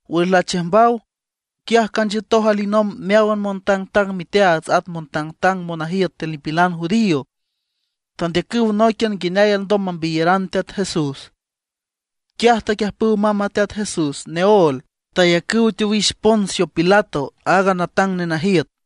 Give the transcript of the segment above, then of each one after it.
Wüx lachiüjmbaw, quiaj canchiütoj alinomb meáwan montangtang miteaats at montangtang monajiüt tiül nipilan judío. Tandeacüw nóiquian nguineay alndom mambiyaran Teat Jesús. Quiaj taquiüjpüw mamb a Teat Jesús neóel, tayacüw teowix Poncio Pilato, aaga natang nenajiüt.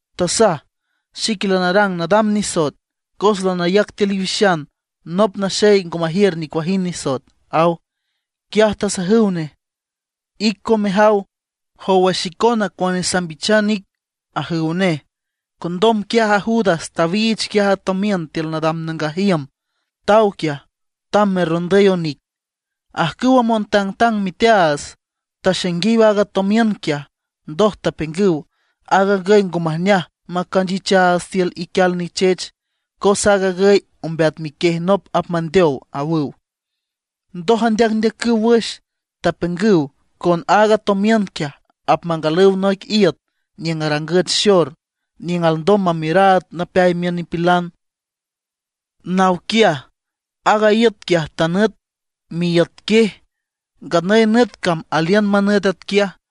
Tasaj: ―Xique lanarang nadam nisoet, cos lanayac tiül iwixan nop naxey ngo majiür nicuajind nisoet ―aw. Quiaj tasajüw nej: ―Ic coen mejaw, jowa xicona cuane sambichan ic ―ajüw nej. Condom quiaj a Judas tawiich quiaj a tomiün tiül nadam nangaj iüm, taw quiaj, tamb merrondüy onic. Ajcüwa montangtang miteaats taxainguiw aaga tomiün quiaj, ndoj tapiüngüw: ―Aag agüy ngo majneaj macanchichaats tiül iquial nichech, cos aag agüy ombeat miquiej nop apmandeow ―awüw. Ndoj andeacndeacüw wüx, tapiüngüw con aaga tomiün quiaj apmangalüw noic iüt niüng arangüch xor, niüng alndom mamiüraad napeay miün nipilan. Naw quiaj, aaga iüt quiaj tanüt miíüt quiej. Nganüy nüt cam aliün manüt atquiaj.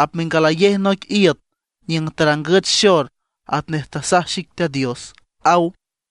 mengalayej noic iüt niüng tarangüch xor, atnej tasaj xic Teat Dios”, aw.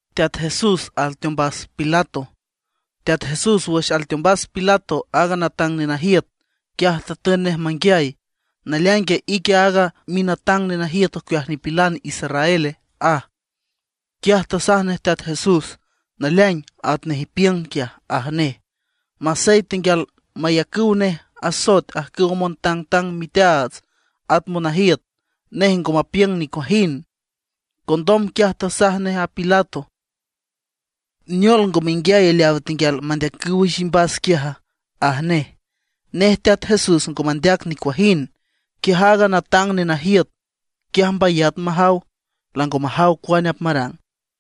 Teat Jesús wüx alteombas Pilato aaga natang nenajiüt, quiaj tatün nej manguiay: ―¿Naleaingue, ique aaga minatang nenajiüt ocueajiw nipilan israele? ―aj. Quiaj tasaj nej Teat Jesús: ―Naleaing, atnej ipiüng quiaj ―aj nej. Masey tenguial mayacüw nej asoet ajcüwa montangtang miteaats at monajiüt, nej ngo mapiüng nicuajind. Condom quiaj tasaj nej a Pilato: ―¿Neol, ngo menguiay leaw tenguial mandeacüw wüx imbas quiaja? ―aj nej. Nej Teat Jesús ngo mandeac nicuajind. Quiaj aaga natang nenajiüt quiaj mbayat majaw, lango majaw cuane apmarang.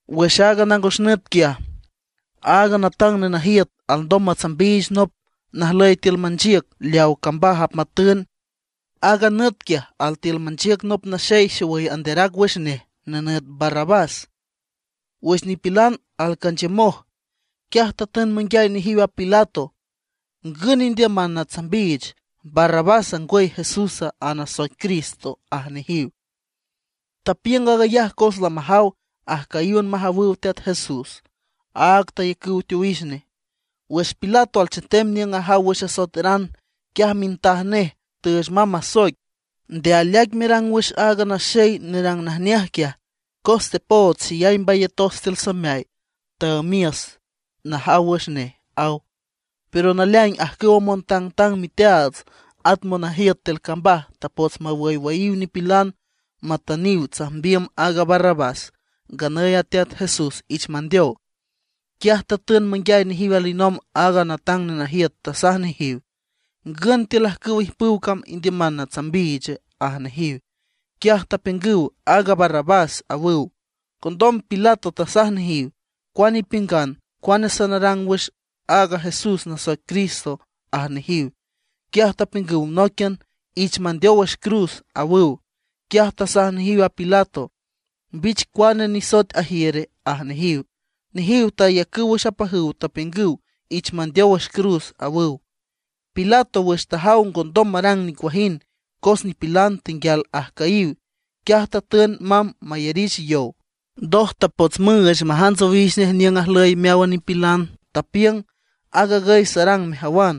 Wüx aaga nangos nüt quiaj, aaga natang nenajiüt alndom matsambiich nop najlüy tiül manchiüc leaw cambaj apmatün. Aaga nüt quiaj altiül manchiüc nop naxey xowüy anderac wüx nej, nenüt Barrabás. Wüx nipilan alcanchiümoj, quiaj tatün manguiay nejiw a Pilato: ―¿Ngün indiüman natsambiich, Barrabása, ngwüy Jesúsa, aaga nasoic Cristo? ―aj nejiw. Tapiüng aag ayaj cos lamajaw ajcüyíwan majawüw Teat Jesús, áag tayacüw teowix nej. Wüx Pilato alchetem niüng ajaw wüx asoeteran, quiaj mintaj nej tüüch mamb masoic: “Nde aleaic merang wüx a naxey nerang najneaj quiaj, cos tepood xeyay mbayatos tiül sameay, taümiüs najaw wüx nej”, aw. Pero naleaing ajcüwa montangtang miteaats, at monajiüt tiül cambaj tapots mawüywüyiw nipilan matüniw tsajmbiüm aaga Barrabás, nganüy a Teat Jesús ich mandeow. Quiaj tatün manguiay nejiw alinomb aaga natang nenajiüt, tasaj nejiw: ―¿Ngün tiül ajcüwa ijpüw cam indiüman natsambiiche? ―aj nejiw. Quiaj tapiüngüw: ―¡Aaga Barrabás! ―awüw. Condom Pilato tasaj nejiw: ―¿Cuane ipiüngan, cuane sanarang wüx aaga Jesús nasoic Cristo? ―aj nejiw. Quiaj tapiüngüw nóiquian: ―¡Ich mandeow wüx cruz! ―awüw. Quiaj tasaj nejiw a Pilato: ―¿Mbich cuane nisoet ajiüre? ―aj nejiw. Nejiw tayacüw wüx apajüw, tapiüngüw: ―¡Ich mandeow wüx cruz! ―awüw. Pilato wüx tajaw ngondom marang nicuajind, cos nipilan tenguial ajcüyiw, quiaj tatün mamb mayarich yow. Ndoj tapots müüch majants owix nej niüng ajlüy meáwan nipilan. Tapiüng: ―Aag agüy sarang mejawan,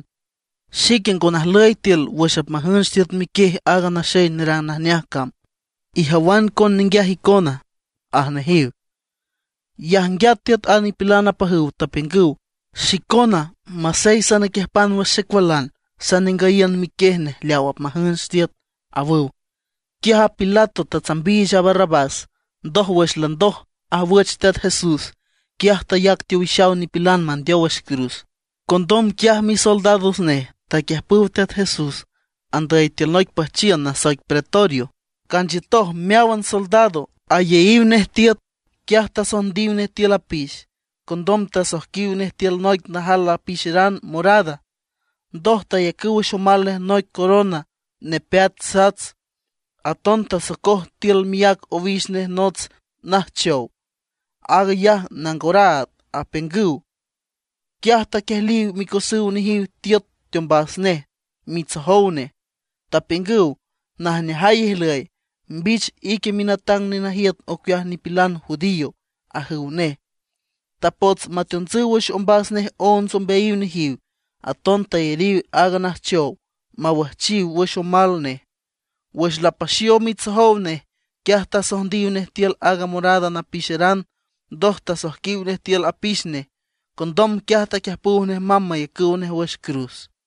xique ngo najlüy tiül wüx apmajünch tiüt miquiej aaga naxey nerang najneaj cam, ijawan coen ninguiaj icona ―aj nejiw. Yajnguiat tiüt a nipilan apajüw, tapiüngüw: ―Xicona masey sanaquiüjpan wüx xecualan sanengüyiün miquiej nej leaw apmajünch tiüt ―awüw. Quiaj a Pilato tatsambiich a Barrabás, ndoj, wüx landoj ajwüch Teat Jesús, quiaj tayac teowixaw nipilan mandeow wüx cruz. Condom quiaj misoldados nej taquiüjpüw Teat Jesús andüy tiül noic püjchiün nasoic pretorio, canchiütoj meáwan soldado, ayeyiw nej tiüt. Quiaj tasojndiw nej tiül apix, condom tasoijquiw nej tiül noic najal napixeran morada. Ndoj tayacüw wüx omal nej noic corona nepeat sats, aton tasocoj tiül miác owix nej nots najchow, aag ayaj nangoraad apiüngüw. Quiaj taquiejliw micosüw nejiw tiüt teombas nej mitsojow nej. Tapiüngüw: ―¡Najneajay ijlüy, mbich ique minatang nenajiüt ocueajiw nipilan judío! ―ajüw nej. Tapots mateontsüw wüx ombas nej onts ombeayiw nejiw, aton tayariw aaga najchow mawüjchiw wüx omal nej. Wüx lapaxiow mitsojow nej, quiaj tasojndiw nej tiül aaga morada napixeran, ndoj tasoijquiw nej tiül apix nej. Condom quiaj taquiüjpüw nej mamb mayacüw nej wüx cruz.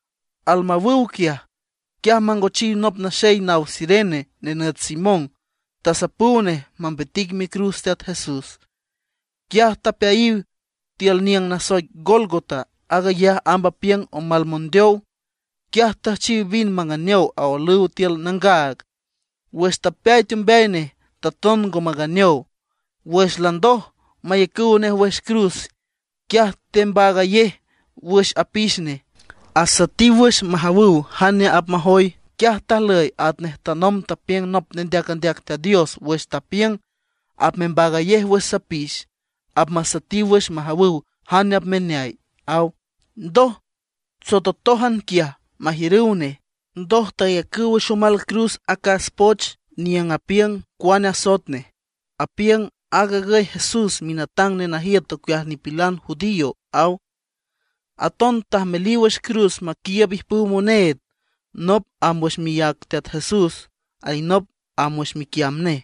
Almawüw quiaj, quiaj mangochiw nop naxey naw Cirene, nenüt Simón. Tasapüw nej mambitic micruz Teat Jesús. Quiaj tapeayiw tiül niüng nasoic Gólgota, aag ayaj amb apiüng omal mondeow. Quiaj tüjchiw vin manganeow aolüw tiül nangaag, wüx tapeay teombeay nej taton ngo manganeow. Wüx landoj mayacüw nej wüx cruz, quiaj tembaagayej wüx apix nej, asüetiw wüx majawüw jane apmajoy. Atquiaj tajlüy atnej tanomb tapiüng nop nendeac andeac Teat Dios wüx tapiüng: “Apmembaagayej wüx sapix, apmasüetiw wüx majawüw jane apmeneay”, aw. Ndoj tsototójan quiaj majiürüw nej. Ndoj tayacüw wüx omal cruz acas poch niüng apiüng cuane asoet nej, apiüng: “Aag agüy Jesús, minatang nenajiüt ocueajiw nipilan judío”, aw. Aton tajmeliw wüx cruz maquiiüb ijpüw moneed, nop amb wüx miác Teat Jesús, alinop amb wüx miquiamb nej.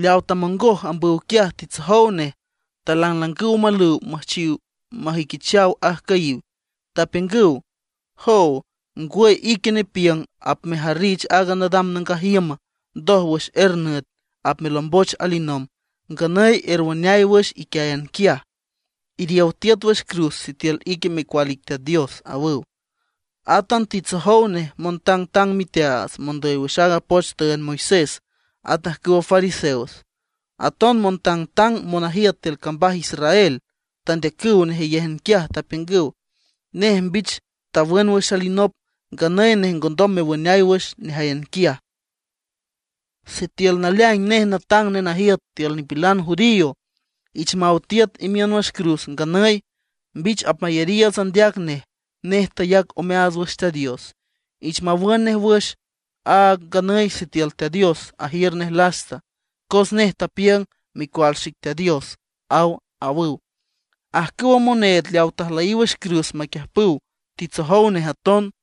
Leaw tamongoj ambüw quiaj titsojow nej, talanglangüw omalüw müjchiw majüiquichaw ajcüyiw. Tapiüngüw: ―¡Joow, ngwüy ique nepiüng apmejarrich aaga nadam nangaj iüm, ndoj wüx er nüt apmelomboch alinomb! ¡Nganüy erwüneay wüx iquiáyan quiaj; iriow tiüt wüx cruz sitiül ique Micual ic Teat Dios! ―awüw. Átan titsojow nej montangtang miteaats, mondüy wüx aaga poch tüünd Moisés, at ajcüwa fariseos, aton montangtang monajiüt tiül cambaj Israel. Tandeacüw nejeyéjan quiaj, tapiüngüw: ―Nej mbich tawün wüx alinop, nganüy nej ngondom mewüneay wüx nejáyan quiaj. Sitiül naleaing nej natang nenajiüt tiül nipilan judío, ich maw tiüt imiün wüx cruz nganüy, mbich apmayariiüts andeac nej. Nej tayac omeaats wüx Teat Dios, ich mawün nej wüx a nganüy sitiül Teat Dios ajiür nej lasta. Cos nej tapiüng: “Micual xic Teat Dios”, aw, ―awüw. Ajcüwa moneed leaw tajlüyiw wüx cruz maquiüjpüw titsojow nej aton.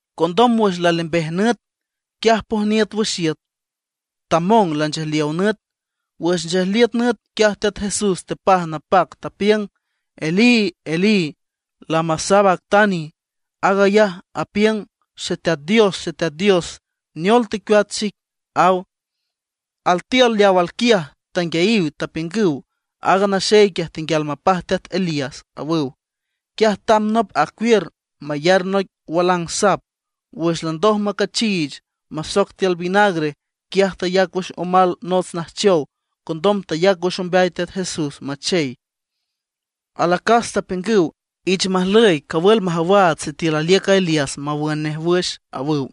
Condom wüx lalembej nüt, quiaj pojniüt wüx iüt tamong lanchejliow nüt. Wüx nchejliüt nüt quiaj Teat Jesús tepaj napac, tapiüng: ―Elí, Elí, ¿lama sabactani? Aag ayaj apiüng: Xeteat Dios, Xeteat Dios, ¿neol tecueat xic? ―aw. Altiül leaw alquiaj tanguiayiw, tapiüngüw: ―Aaga naxey quiaj tenguial mapaj teat Elías ―awüw. Quiaj tamb nop acuiür mayar noic walang sap. Wüx landoj macachiich, masoc tiül vinagre, quiaj tayac wüx omal nots najchow. Condom tayac wüx ombeay Teat Jesús machey. Alacas tapiüngüw: ―Ich majlüy, cawül majawaats sitiül aliüc a Elías mawün nej wüx ―awüw.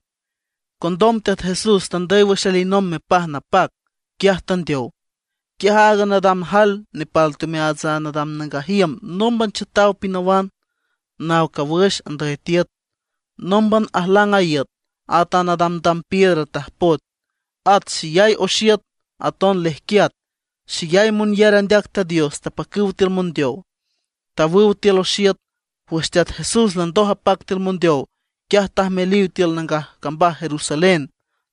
Condom Teat Jesús tandüy wüx alinomb mepaj napac, quiaj tandeow. Quiaj aaga nadam jael nepal teomeaats a nadam nangaj iüm nómban chiütaw pinawan, naw cawüx andüy tiüt. Nómban ajlang a iüt, at a nadamdam piedra tajpoet. At xeyay oxiüt aton lejquiat; xeyay monyar andeac Teat Dios tapacüw tiül mondeow. Tawüw tiül oxiüt, wüx Teat Jesús landoj apac tiül mondeow, quiaj tajmeliw tiül nangaj cambaj Jerusalén.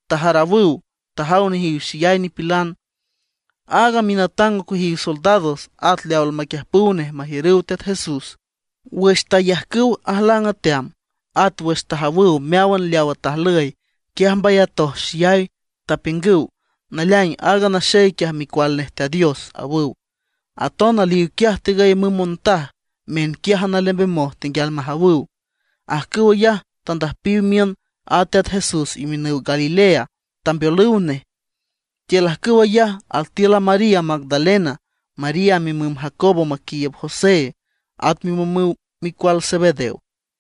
Tajarawüw, tajaw nejiw xeyay nipilan. Aaga minatang ocueajiw soldados, at leaw almaquiiüb nej majiürüw Teat Jesús, wüx tayajcüw ajlang ateam, at wüx tajawüw meáwan leawa tajlüy, quiaj mbayatoj xeyay, tapiüngüw: ―Naleaing aaga naxey quiaj Micual nej Teat Dios ―awüw. Aton aliw quiaj tigüy müm montaj, miünquiájan alembemoj tenguial majawüw. Ajcüw ayaj tandüjpiw miün a Teat Jesús imiünüw Galilea, tambeolüw nej. Tiül ajcüw ayaj altiül a María Magdalena, María mimüm Jacobo maquiiüb José, at mimümüw micual Zebedeo.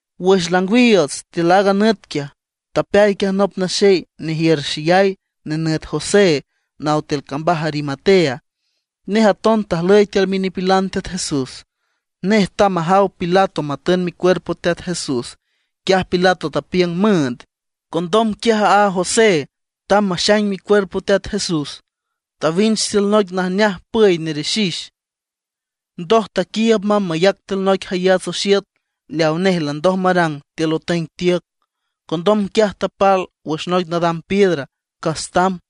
Wüx langwiiüts tiül aaga nüt quiaj, tapeay quiaj nop naxey nejiür xeyay, nenüt José, naw tiül cambaj Arimatea. Nej aton tajlüy tiül minipilan Teat Jesús. Nej tamb majaw Pilato matün micuerpo Teat Jesús. Quiaj Pilato tapiüng müünd. Condom quiaj aaga José tamb maxaing micuerpo Teat Jesús, tawinch tiül noic najneaj püy nerixix. Ndoj taquiiüb mamb mayac tiül noic jayats oxiüt leaw nej landoj marang tiül otüeng tiüc. Condom quiaj tapal wüx noic nadam piedra, cas tamb.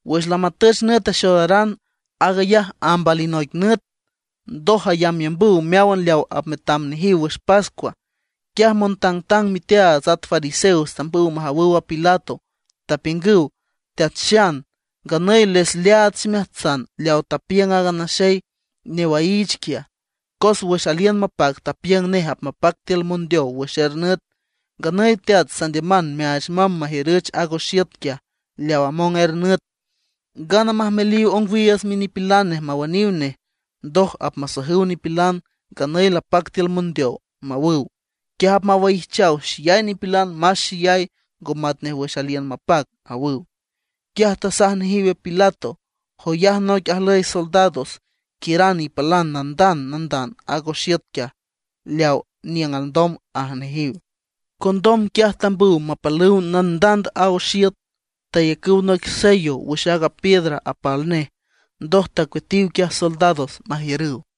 Wüx lamatüch nüt axoodaran, aag ayaj amb alinoic nüt ndoj ayambyambüw meáwan leaw apmetam nejiw wüx pascua, quiaj montangtang miteaats at fariseos tambüw majawüw Pilato. Tapiüngüw: ―Teat Xan, nganüy les leaad ximeajtsan leaw tapiüng aaga naxey newaiich quiaj. Cos wüx aliün mapac tapiüng nej apmapac tiül mondeow wüx er nüt. Nganüy teat, sandiüman meaach mamb majiürüch aag oxiüt quiaj leaw among er nüt, ngana majmeliw ongwiiüts minipilan nej mawüniw nej, ndoj apmasajüw nipilan: “Nganüy lapac tiül mondeow”, mawüw. Quiaj apmawaijchaw xeyay nipilan más xeyay, ngo matnej wüx aliün mapac ―awüw. Quiaj tasaj nejiw Pilato: ―Joyaj noic ajlüy soldados, quiüran ipalan nandand nandand aaga oxiüt quiaj leaw niüng alndom ―aj nejiw. Condom quiaj tambüw mapalüw nandand a oxiüt. Tayacüw noic sello wüx aaga piedra apal nej, ndoj tacueatiw quiaj soldados majiürüw.